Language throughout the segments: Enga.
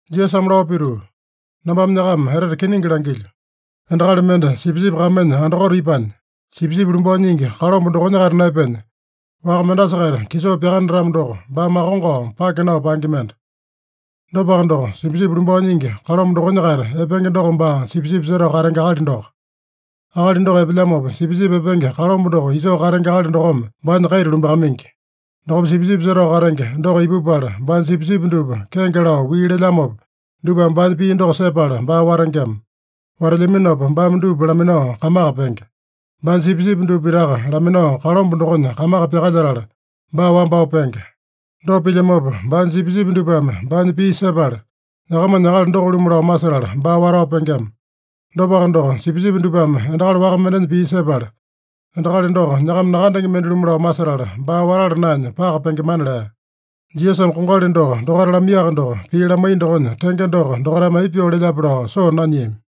Jisasame lao pituu, “Nambame nyakama etete kiningi langilyo: Endakali mende sipisipi kamenya andakote ipanya, sipisipi lumbao nyingi kalomba dokonya-kaita naepenya, waka mendasa-kaita kisoo pyakanatamo doko, baa makongao, pake nao paenge mende. Dopaka doko, sipisipi lumbao nyingi kalomba dokonya-kaita epenge doko baa sipisipi setao katenge akali doko. Akali doko epelyamopa, sipisipi epenge kalomba doko isoo katenge akali dokome baanya kaita lumbakamaingi. Dokopa sipisipi setao katenge doko ipupala, baanya sipisipi dupa kenge lao wii lelyamopa, dupame baanya pii doko sepala baa watengema. Watelyaminopa baame dupa laminao kamaka penge. Baanya sipisipi dupa pitaka laminao kalomba dokonya kamaka pyakalyetala, baa wambao penge. Dopa pilyamopa, baanya sipisipi dupame baanya pii sepala, nyakamanya akali doko-lumu lao masetala, baa watao pengema. Dopaka doko, sipisipi dupame endakali waka mendenya pii sepala, endakali doko nyakama nakandenge mende-lumu lao masetala, baa watala naenya paka pengemana” lea. Jisasame kongali doko dokaita lamaiyaka doko, pii lamaiya dokonya tenge doko dokaitame aipa pyoo lelyape lao soo nanyiami.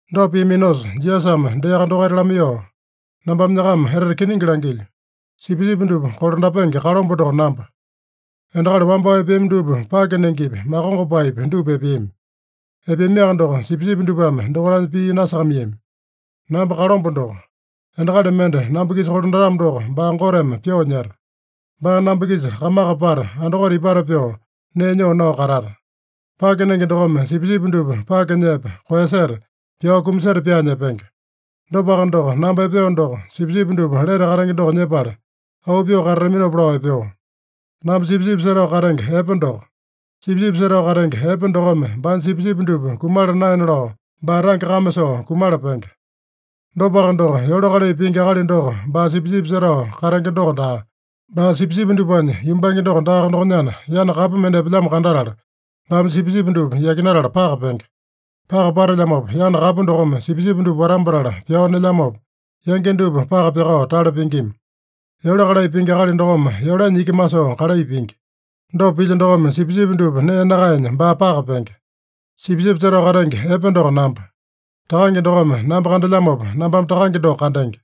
Dopa piaminosa Jisasame deaka dokaita lamaiyoo, “Nambame nyakama etete kiningi langilyo: Sipisipi dupa kolandapenge kalomba doko namba. Endakali wambao epeami dupa pake nengepi, makongopaepi dupa epeami. Epeamiaka doko, sipisipi dupame dokaitanya pii nasakamaiyami. Namba kalomba doko. Endakali mende namba-kisa kolandatamo doko, baa Goteme pyoo nyeta. Baa namba-kisa kamaka pata, andakote ipata pyoo, nee nyoo nao katata. Pake nenge dokome sipisipi dupa pake nyepa, koeyaseta, pyao kumaseta pyaanya epenge. Dopaka doko, namba epeo doko, sipisipi dupa lete katenge doko nyepala, auu pyoo katataminopa lao epeo. Namba sipisipi setao katenge epe doko. Sipisipi setao katenge epe dokome baanya sipisipi dupa kumala naena lao baa tange kame soo kumala penge. Dopaka doko, yole kalai pingi akali doko baa sipisipi setao katenge doko daa, baa sipisipi dupanya yumbange doko daaka dokonyana, yana kapu mende epelyamo kandatala, baame sipisipi dupa yakinatala paka penge. Paka patelyamopa, yana kapu dokome sipisipi dupa watambatala pyao nelyamopa, yangi dupa paka pyakao tale pingima. Yole kalai pingi akali dokome yolenya iki masoo kalai pingi. Dopa pilya dokome, sipisipi dupa nee nakaenya baa paka penge. Sipisipi setao katenge epe doko namba. Takange dokome namba kandelyamopa, nambame Takange doko kandenge.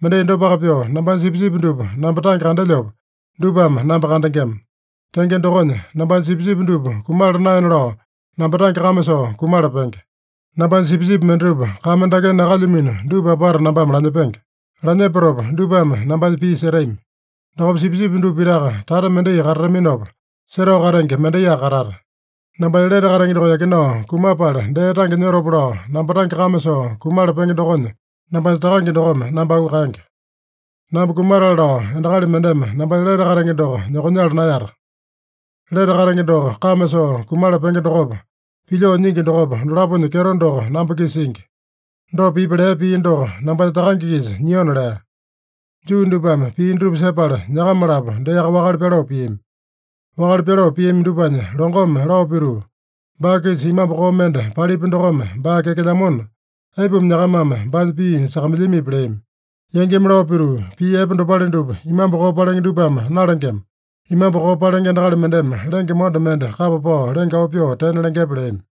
Mendai dopaka pyoo, nambanya sipisipi dupa namba tange kandelyopa, dupame namba kandengema. Tenge dokonya, nambanya sipisipi dupa kumala naena lao namba tange kame soo kumala penge. Nambanya sipisipi mendatupa kame dakenya nakalyamino dupa apata nambame lanyepenge. Lanyepatopa dupame nambanya pii setami. Dokopa sipisipi dupa pitaka tata mendai katataminopa, setao katenge mendaiyaka katata. Nambanya lete katenge doko yakinao kumapala dee tange nyotopa lao, namba tange kame soo kumala penge dokonya, nambanya Takange dokome namba auu kaenge. Namba kumatale lao endakali mendeme nambanya lete katenge doko nyokonyala naeyata. Lete katenge doko kame soo kumala penge dokopa, pilyoo nyingi dokopa, dolaponya kyeto doko namba-kisa singi. Dopa pipi lea pii doko nambanya Takange-kisa nyiona” lea. Juu dupame pii dutupa sepala, nyakama-lapo deaka wakale pyaloo piami. Wakale pyaloo piami dupanya longome lao pituu, “Baa-kisa imambu koo mende palipya dokome baa kyakelyamona, aipuma nyakamame baanya pii sakamailyamipi?” leami. Yangimi lao pituu, “Pii epe dopale dupa imambu koo palenge dupame nalengema. Imambu koo palenge akali mendeme endakali lenge monda mende kapa pao lenge auu pyoo tena lengepe?” leami.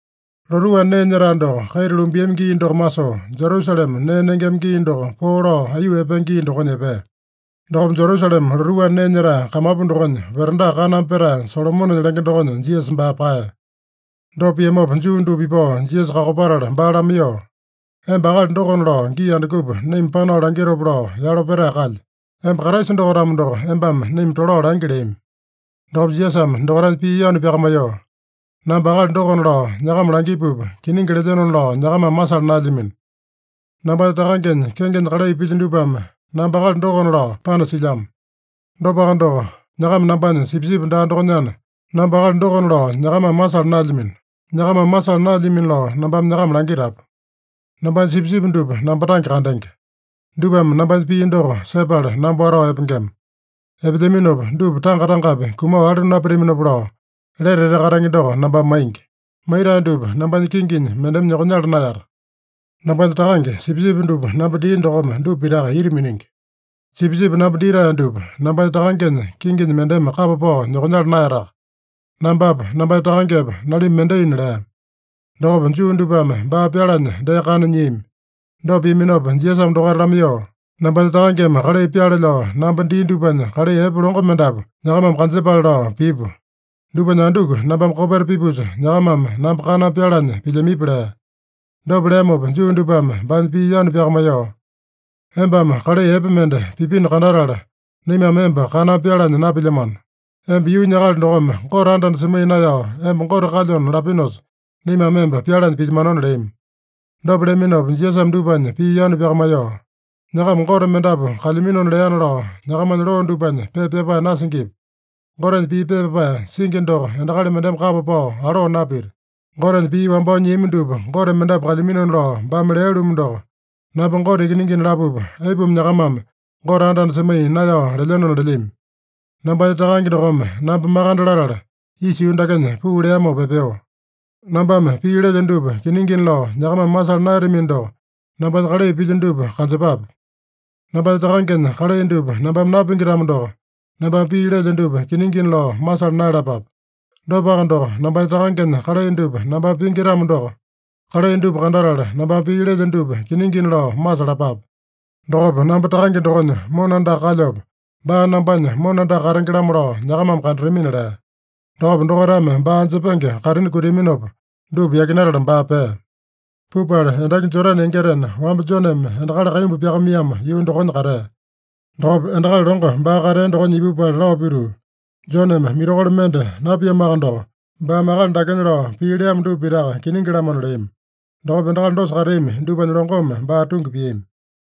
Lotuu anda nee nyetae doko kaita lumbiami gii doko masoo, Jerusalema nee nengema gii doko poo lao aiyuu epenge gii dokonya epea. Dokopa Jerusalema lotuu anda nee nyetae kamapu dokonya veranda kaname petae Solomonenya lenge dokonya Jisasa baa paeya. Dopa piamopa, Juu dupa ipao Jisasa kakopatala baa lamaiyoo, “Emba akali dokona lao gii andukupa naima panao langitopa lao yalo petae kalye? Emba Kraisa doko-tamo doko, embame naima tolao langi” leami. Dokopa Jisasame dokaitanya pii yanu pyakamaiyoo, “Namba akali dokona lao nyakama langipupa, kiningi lelyenona lao nyakamame masala naelyamino. Nambanya Takangenya kengenya kalai pilyo dupame namba akali dokona lao panasilyamo. Dopaka doko, nyakama nambanya sipisipi daa dokonyana, namba akali dokona lao nyakamame masala naelyamino. Nyakamame masala naeyalamino lao nambame nyakama langitapu. Nambanya sipisipi dupa namba tange kandenge. Dupame nambanya pii doko sepala namba watao epengema. Epelyaminopa dupa tanga-tangapi kumao alu napitaminopa lao lete etete katenge doko nambame maingi. Maitae dupa nambanya kinginya mendeme nyokonyala naeyata. Nambanya Takange, sipisipi dupa namba dia dokome dupa pitaka ita miningi. Sipisipi namba ditae dupa nambanya Takangenya kinginya mendeme kapa pao nyokonyala naeyataka. Nambapa, nambanya Takangepa, nalimba mendaina” lea. Dokopa Juu dupame baa pyalanya dee kana nyiami. Dopa piaminopa Jisasame dokaita lamaiyoo, “Nambanya Takangeme kalai pyaale lao namba dia dupanya kalai epe longo mendapu nyakamame kanjepale lao pipu. Dupanya anduku nambame kopeta pipusa, nyakamame namba kaname pyalanya pilyamipi?” lea. Dopa leamopa Juu dupame baanya pii yanu pyakamaiyoo, “Embame kalai epe mende pipino kandatala, naimame emba kaname pyalanya napilyamano. Emba yuunya akali dokome Gote anda-anda semaiya naeyao emba Gote kalyona lapinosa, naimame emba pyalanya pilyamanona” leami. Dopa leaminopa Jisasame dupanya pii yanu pyakamaiyoo, “ ‘Nyakama gote mendapu kalyaminona leana’ lao nyakamanya loo dupanya pepa pyapae nasingipi? Gotenya pii pepa pyapae singi doko endakali mendeme kapa pao aloo napita. Gotenya pii wambao nyiami dupa gote mendapu kalyaminona lao baame lea-lumu doko, ‘Namba Gote Ikiningina’ lapupa, aipuma nyakamame ‘Gote anda-anda semaiya naeyao lelyenona’ lelyami? Nambanya Takange dokome namba makande latala, isa yuu dakenya puu leamopa epeo. Nambame pii lelyo dupa kiningina lao nyakamame masala naeyatamino doko, nambanya kalai pilyo dupa kanjepape. Nambanya Takangenya kalai dupa nambame napingi-tamo doko, nambame pii lelyo dupa kiningina lao masala naeyalapape. Dopaka doko, nambanya Takangenya kalai dupa nambame pingi-tamo doko, kalai dupa kandatala nambame pii lelyo dupa kiningina lao masalapape. Dokopa namba Takange dokonya mona andaka kalyopa, baa nambanya mona andaka katenge-lamo lao nyakamame kandatamina” lea. Dokopa dokaitame baa anjepenge kaitini kutiaminopa, dupa yakinatala baa pea. Pupala endaki Jodane yangitena, wamba Joneme endakali kaimbu pyakamaiyamo yuu dokonya katea. Dokopa endakali longo baa katea dokonya ipupala lao pituu, “Joneme mirakolo mende napiamoaka doko, baame akali dakenya lao pii leamo dupa pitaka kiningi-lamona” leami. Dokopa endakali dosa kateami dupanya longome baa tungi piami.